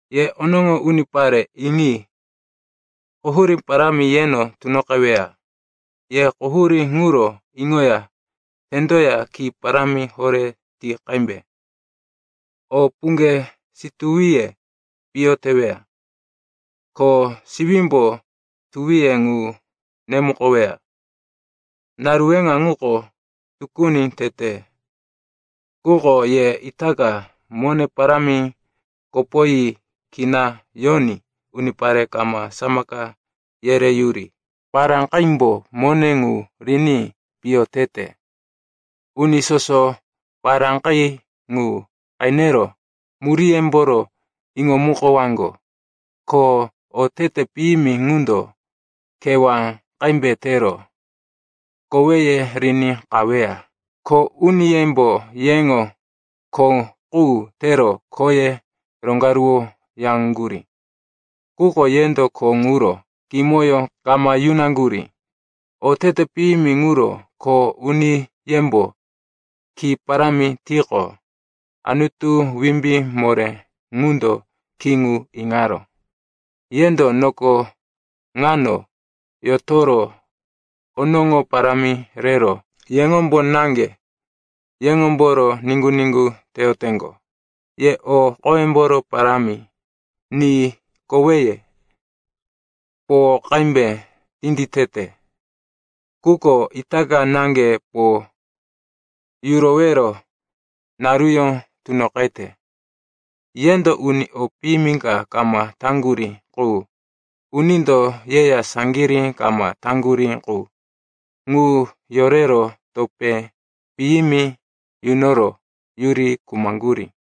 Ye onoŋo unipare, iŋi. Quhurí parámi yeno tunoqeweya. Ye quhurí ŋuro iŋoya tendoya ki parámi horé ti qembe. O puŋge situwiye piyo teweya, ko siwímbo tuwiye ŋu nemukoweya. Naru weŋa ŋuko tukuni tete. Quko ye itaka mone parámi kopoyi kina yoní unipare kama samaka yereyuri paráqimbo mone ŋu riní piyo tete. Uni soso paráqi ŋu qenero muríyemboro iŋomukowaŋgo. Ko otete piyimi ŋundo kewá qembe tero koweye riní qaweya. Iŋi. Kho uniyembo yeŋo kho qu tero khoye roŋgaruwoyaŋgurí. Quko yendo kho ŋuro kimoyó kama yunaŋgurí. Otete piyimi ŋuro kho uniyembo ki parámi tiqo, Anutu Wimbí Moré ŋundo ki ŋu iŋaró. Yendo noko ŋano yotoro onoŋo parámi rero yeŋombo naŋge yeŋomboro niŋgu-niŋgu teyoteŋgo. Ye o qoyemboro parámi ni koweye po qembe tinditete. Quko itaka naŋge po yurowero naruyó tunoqete. Yendo uni o piyimi ka kama taŋgurí qu, unindo yeya saŋgirí kama taŋgurí qu, ŋu yorero topé piyimi yunoro yuri khumaŋgurí.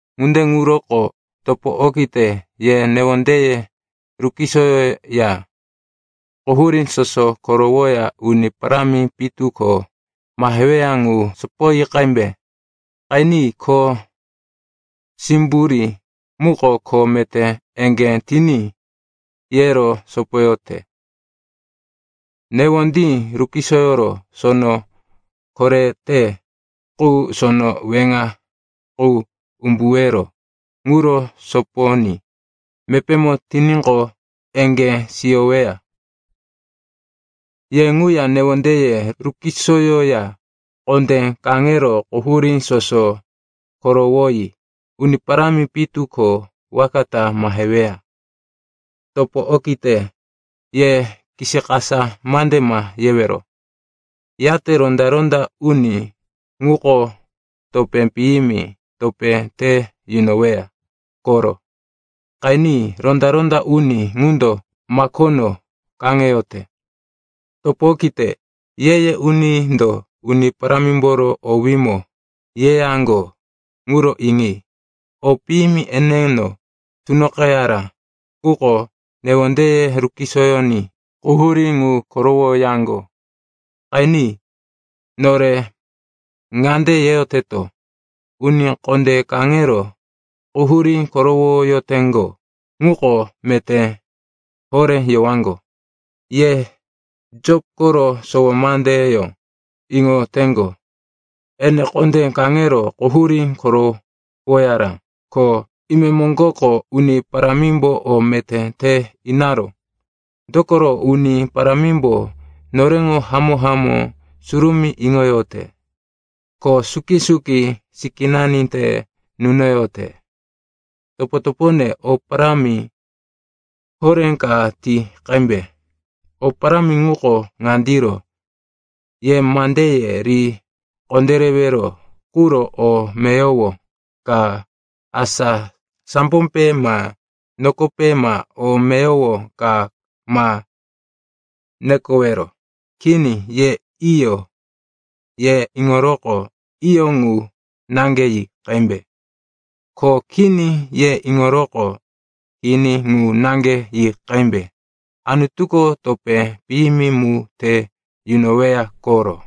Ŋunde ŋuroko, topo okite, ye newondeye rukisoyoya quhurí soso korowoya Uni Parámi pitu ko maheweya ŋu sopoyi qembe. Qeni, kho simburí muko kho meté eŋgé tiní yero sopoyote. Newondí rukisoyoro sono korete qu, sono weŋa qu umbuwero ŋuro soponí mepémo tiníqo, eŋgé siyoweya. Ye ŋuya newondeye rukisoyoya kondé kaŋero quhurí soso korowoyi Uni Parámi pitu ko waka ta maheweya. Topo okite, ye kisikasa mande ma yewero. Yate ronda-ronda uni ŋuko topé piyimi topé te yunoweya koro. Qeni, ronda-ronda uni ŋundo makono kaŋeyote. Topo okite, ye-ye unindo Uni Parámimboro owímo yeyaŋgo ŋuro iŋi. O piyimi eneno tunoqeyara, quko newondeye rukisoyoní quhurí ŋu korowoyaŋgo. Qeni. Nore ŋande yeyoteto, “Uni kondé kaŋero quhurí korowoyoteŋgo ŋuko meté horé yowaŋgo.” Ye Jop koro sowo mandeyó iŋoyoteŋgo, ene kondé kaŋero quhurí korowoyara. Ko imemoŋgoko Uni Parámimbo o meté te inaró. Dokoro Uni Parámimbo noreŋo hamó-hamó surumí iŋoyote, ko suki-suki sikínani te nunoyote. Topo-topone, o parámi horé ka ti qembe. O parámi ŋuko ŋandiro: ye mandeye ri kondérewero quro o meyowo ka, asa sambope ma nokope ma o meyowo ka ma nekowero. Kini, ye “Iyo,” ye iŋoroqo, “Iyo,” ŋu naŋge yi qembe. Ko, “Kini,” ye iŋoroqo, “Kini,” ŋu naŋge yi qembe. Anutuko topé piyimi mu te yunoweya koro.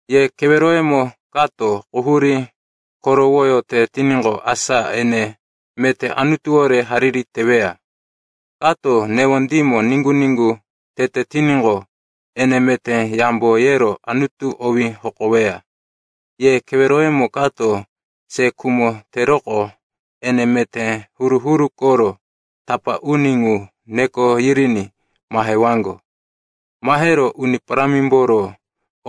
Ye keweroyemo kato quhurí korowoyote tiníqo, asa ene meté Anutuwore hariri teweya. Kako newondímo niŋgu-niŋgu tete tiníqo, ene meté yambo yero Anutu owí hokoweya. Ye keweroyemo kato se khumo teroqo, ene meté huru-huru koro tapá uni ŋu neko yiriní mahewaŋgo. Mahero Uni Parámimboro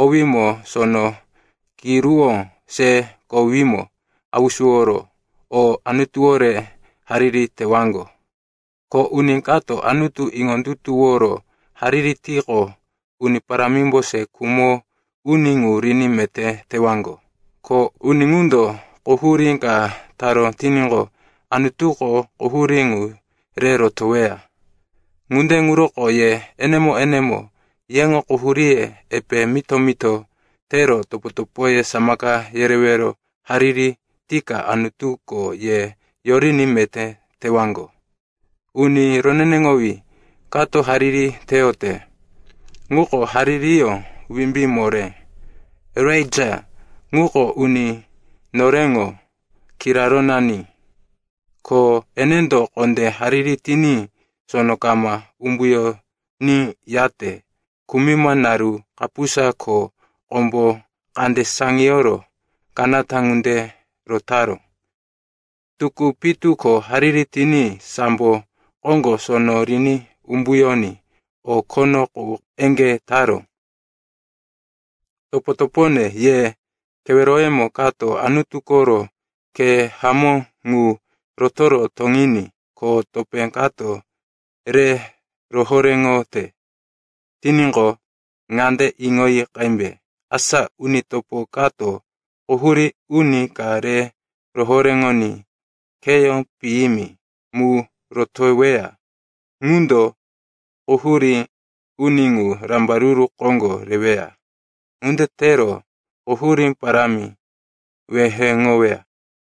owímo sono kiruwó se kowímo hausuworo, ko Anutuwore hariri tewaŋgo. Ko uni kato Anutu iŋondutuworo hariri tiqo, Uni Parámimbo se khumo uni ŋu riní meté tewaŋgo. Ko uni ŋundo quhurí ka taró tiníqo, Anutuko quhurí ŋu re rotoweya. Ŋunde ŋuroko ye enemo-enemo yeŋo quhuríye epe mito-mito tero topo-topoye samaka yerewero hariri tika Anutuko ye yoriní meté tewaŋgo. Uni roneneŋowí kato hariri teyote ŋuko haririyó wimbí moré. Elaija ŋuko uni noreŋo kirarónani, ko enendo kondé hariri tiní sono kama umbuyoníyate kumima naru kapusa ko kombo kande saŋiyoro kanata ŋunde rotaró. Tukú pitu ko hariri tiní sambo koŋgo sono riní umbuyoní o khono qu eŋgé taró. Topo-topone, ye keweroyemo kato Anutu koro khe hamó ŋu rotoro toŋiní, ko topé kato re rohoréŋote tiníqo, ŋande iŋoyi qembe: asa uni topo kato quhurí uni ka re rohoréŋoní kheyó piyimi mu rotoweya, ŋundo quhurí uni ŋu rambaruru koŋgo reweya. Ŋunde tero quhurí parámi weheŋoweya.